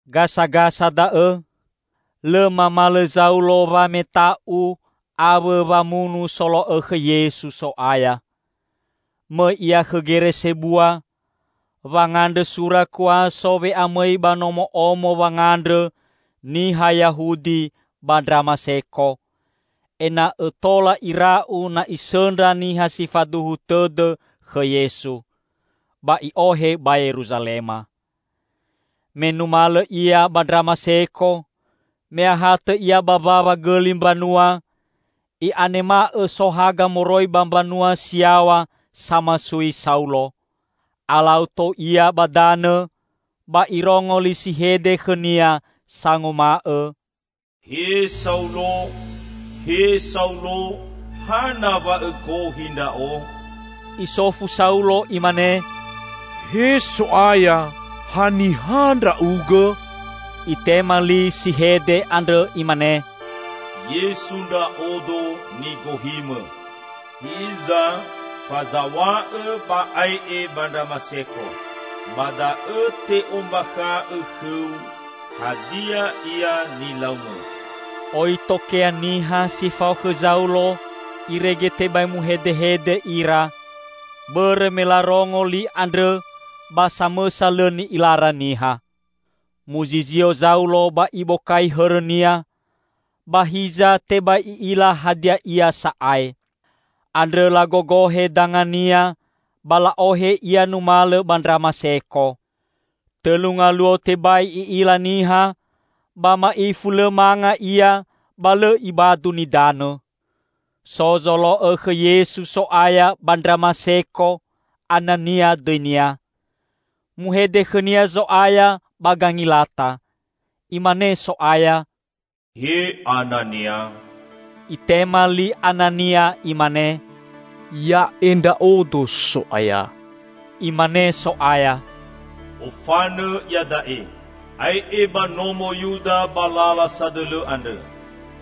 Gasagasa da'õ, lõ mamalõ Zaulo wameta'u awõ wamunu solo'õ khõ Yesu So'aya. Mõi ia khõ gere sebua, wangandrõ sura kuaso we'amõi ba nomo'omo wangandrõ niha Yahudi ba Ndramaseko, ena'õ tola ira'u na isõndra niha si faduhu tõdõ khõ Yesu, ba i'ohe ba Yeruzalema. Me numalõ ia ba Ndramaseko, me ahatõ ia ba mbawa gõli mbanua, i'anema'õ so haga moroi ba mbanua si yaw̃a samasui Saulo. Alau tou ia ba danõ ba irongo li si hede khõnia sanguma'õ, "He Saulo, he Saulo! Hana wa õgohi Ndra'o?" Isofu Saulo imane, "He So'aya, haniha Ndra'ugõ?" Itema li si hede andrõ Imane, "Yesu Ndra'odo, nigohimõ. Hiza fazaw̃a'õ ba ae'e ba Ndramaseko. Ba da'õ te'ombakha'õ khõu hadia ia nilaumõ." Oi tokea niha si fao khõ Zaulo irege tebai muhedehede ira; bõrõ me larongo li andrõ ba samõsa lõ ni'ilara niha. Muzizio Zaulo ba ibokai hõrõnia, ba hiza tebai i'ila hadia ia sa'ae. Andrõ lagogohe dangania ba la'ohe ia numalõ ba Ndramaseko. Tõlu ngaluo tebai i'ila niha ba ma'ifu lõ manga ia ba lõ ibadu nidanõ. So zolo'õ khõ Yesu So'aya ba Ndramaseko, Anania dõinia. Muhede khõnia Zo'aya ba gangilata. Imane So'aya, "He Anania!" Itema li Anania imane, "Ya'e ndra'odo, So'aya." Imane So'aya, "Ofanõ iada'e. Ae'e ba nomo Yuda ba lala sadõlõ andrõ.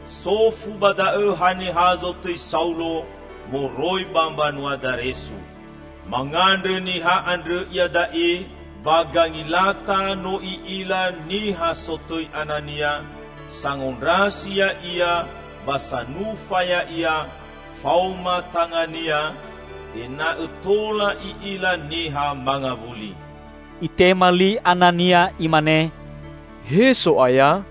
Sofu ba da'õ haniha zotõi Saulo moroi ba mbanua Daresu. Mangandrõ niha andrõ iada'e, ba gangilata no i'ila niha sotõi Anania, sangondrasi ya'ia ba sanufa ya'ia faoma tangania ena'õ tola i'ila niha mangawuli." Itema li Anania imane, "He So'aya,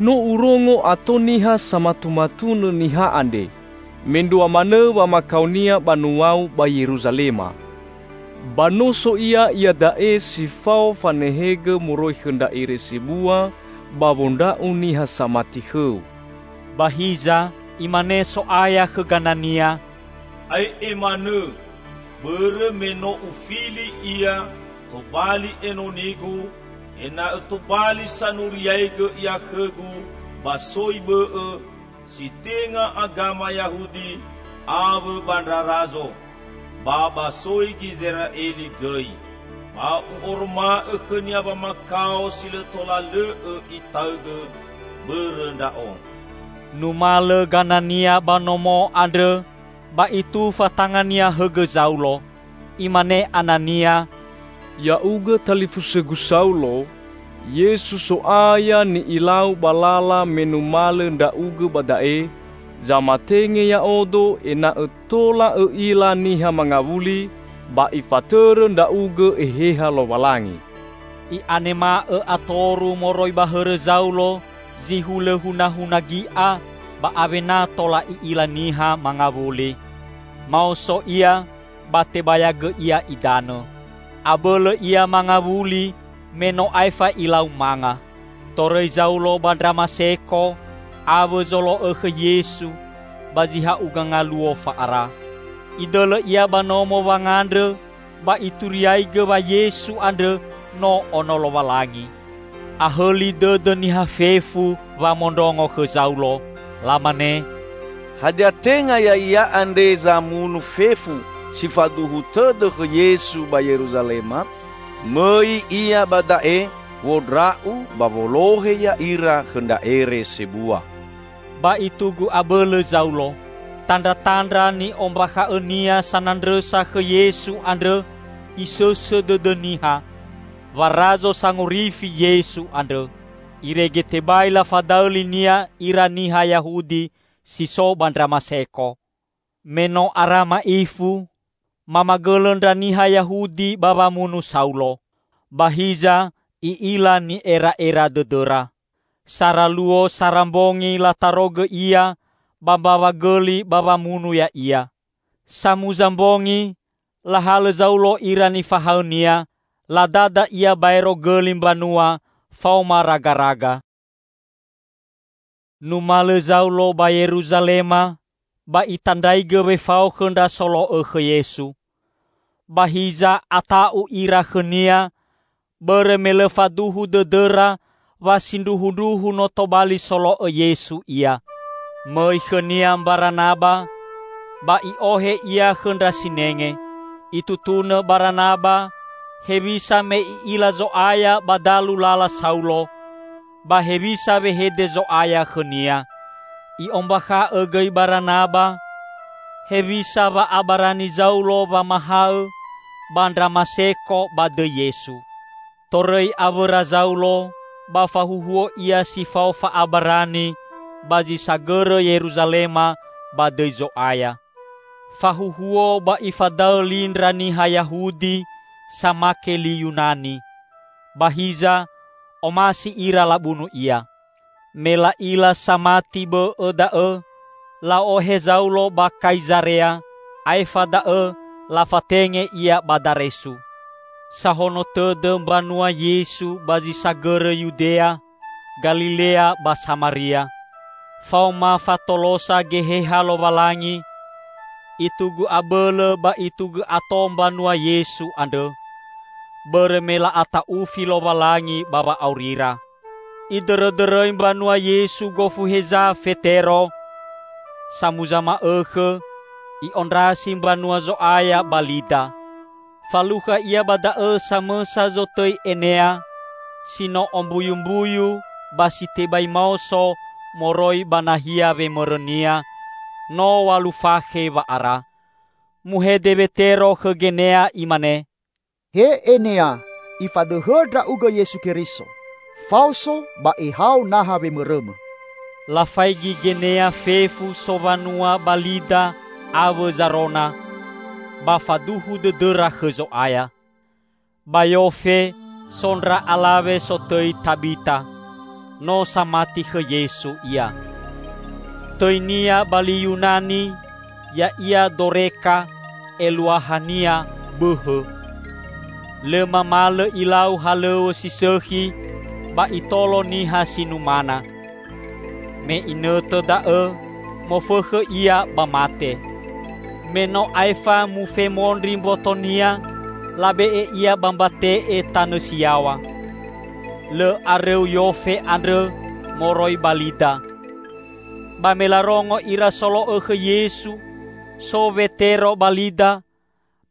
no urongo ato niha samatumatunõ niha andre, mendrua manõ wamakaonia banua-U ba Yeruzalema. Ba no so ia iada'e si fao fanehegõ moroi khõ ndra ere sebua ba wondra'u niha samati khõ-U." Ba hiza imane So'aya khõ Ganania, "Ae'e manõ! Bõrõ me no Ufili ia tobali enoni-Gu, ena'õ tobali sanuriaigõ ia khõ-Gu ba soi bõ'õ si tenga agama Yahudi awõ ba ndra razo, ba ba soi Gizera'eli gõi. Ba U'oroma'õ khõnia wamakao si lõ tola lõ'õ itaõgõ bõrõ Ndra'o." Numalõ Ganania ba nomo andrõ ba itufa tangania hõgõ Zaulo. Imane Anania, "Ya'ugõ talifusõgu Saulo, Yesu So'aya, ni'ilau ba lala me numalõ ndra'ugõ ba da'e, zamatenge ya'odo ena'õ tola õ'ila niha mangawuli ba Ifatõrõ ndra'ugõ Eheha Lowalangi." I'anema'õ atoru moroi ba hõrõ Zaulo zi hulõ hunahuna gi'a ba awena tola i'ila niha mangawuli. Maoso ia, ba tebayagõ ia idanõ. Abõlõ ia mangawuli me no aefa ilau manga. Torõi Zaulo ba Ndramaseko awõ zolo'õ khõ Yesu ba zi ha'uga ngaluo fa'ara. Idõlõ ia ba nomo wangandrõ ba ituriaigõ wa Yesu andrõ no Ono Lowalangi. Ahõli dõdõ niha fefu wamondrongo khõ Zaulo. Lamane, "Hadia tenga ya'ia andre zamunu fefu si faduhu tõdõ khõ Yesu ba Yeruzalema? Mõi ia ba da'e wondra'u ba wolohe ya'ira khõ ndra ere sebua!" Ba itugu abõlõ Zaulo. Tandratandra ni'ombakha'õnia sanandrõsa khõ Yesu andrõ isõsõ dõdõ niha, wa Razo Sangorifi Yesu andrõ, irege tebai lafadaõ linia ira niha Yahudi si so ba Ndramaseko. Me no ara ma'ifu, mamagõlõ ndra niha Yahudi ba wamunu Saulo. Ba hiza i'ila ni'era'era dõdõra. Sara luo sara mbongi latarogõ ia ba mbawa gõli ba wamunu ya'ia. Samuza mbongi, lahalõ Zaulo ira nifahaõnia, ladada ia baero gõli mbanua faoma ragaraga. Numalõ Zaulo ba Yeruzalema ba itandraigõ wefao khõ ndra solo'õ khõ Yesu. Ba hiza ata'u ira khõnia, bõrõ me lõ faduhu dõdõra wa sindruhundruhu no tobali solo'õ Yesu ia. Mõi khõnia Mbaranaba, ba i'ohe ia khõ ndra sinenge. Itutunõ Baranaba hewisa me i'ila Zo'aya ba dalu lala Saulo, ba hewisa wehede Zo'aya khõnia. I'ombakha'õ gõi Baranaba hewisa wa'abarani Zaulo wamahaõ ba Ndramaseko ba dõi Yesu. Torõi awõra Zaulo ba fahuhuo ia si fao fa'abarani ba zi sagõrõ Yeruzalema ba dõi Zo'aya. Fahuhuo ba ifadaõ li ndra niha Yahudi samake li Yunani, ba hiza omasi ira labunu ia. Me la'ila samati bõ'õ da'õ, la'ohe Zaulo ba Kaizarea, aefa da'õ lafatenge ia ba Daresu. Sahono tõdõ mbanua Yesu ba zi sagõrõ Yudea, Galilea ba Samaria. Faoma fatolosa Geheha Lowalangi, itugu abõlõ ba itugu ato mbanua Yesu andrõ, bõrõ me la'ata'ufi Lowalangi ba wa'aurira. Idõrõdõrõi mbanua Yesu gofu heza Fetero. Samuza ma'õkhõ i'ondrasi mbanua Zo'aya ba Lida. Falukha ia ba da'õ samõsa zotõi Enea, si no ombuyumbuyu ba si tebai maoso moroi ba nahia wemõrõnia no w̃alu fakhe wa'ara. Muhede Wetero khõ Genea imane, "He Enea, Ifadõhõ ndra'ugõ Yesu Keriso. Faoso ba ehao naha wemõrõmõ." I'anema'õ maoso Genea. Lafaigi Genea fefu sowanua ba Lida awõ Zarona, ba faduhu dõdõra khõ Zo'aya. Ba Yofe, so ndra alawe sotõi Tabita. No samati khõ Yesu ia. (Tõinia ba li Yunani ya'ia Doreka eluahania bõhõ.) Lõ mamalõ ilau halõw̃õ si sõkhi ba itolo niha si numana. Me inõtõ da'õ mofõkhõ ia ba mate. Me no aefa mufemondri mbotonia, labe'e ia ba mbate'e tanõ si yaw̃a. Lõ arõu Yofe andrõ moroi ba Lida. Ba me larongo ira solo'õ khõ Yesu so Wetero ba Lida,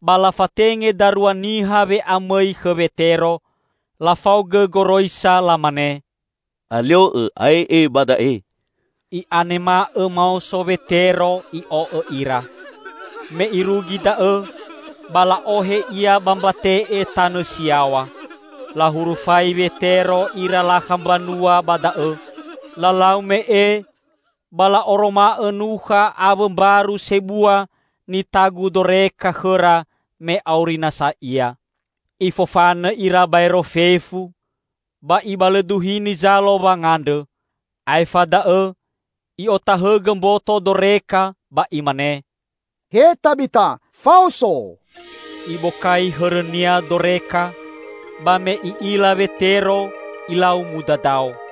ba lafatenge darua niha we'amõi khõ Wetero, lafaogõ goroisa lamane, "Alio'õ ae'e ba da'e." I'anema'õ maoso Wetero i'o'õ ira. Me irugi da'õ, ba la'ohe ia ba mbate'e tanõ si yaw̃a. Lahurufai Wetero ira lakha mbanua ba da'õ, lalau me'e ba la'oroma'õ nukha awõ mbaru sebua nitagu Doreka khõra me auri nasa ia. Ifofanõ ira baero fefu, ba ibalõduhini zalo wangandrõ. Aefa da'õ i'otahõgõ mboto Doreka ba imane, "He Tabita, faoso!" Ibokai hõrõnia Doreka, ba me i'ila Wetero ilau mudadao.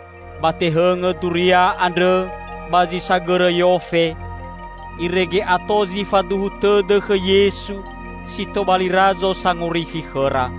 Ba tehõngõ duria andrõ ba zi sagõrõ Yofe, irege ato zi faduhu tõdõ khõ Yesu si tobali Razo Sangorifi khõra.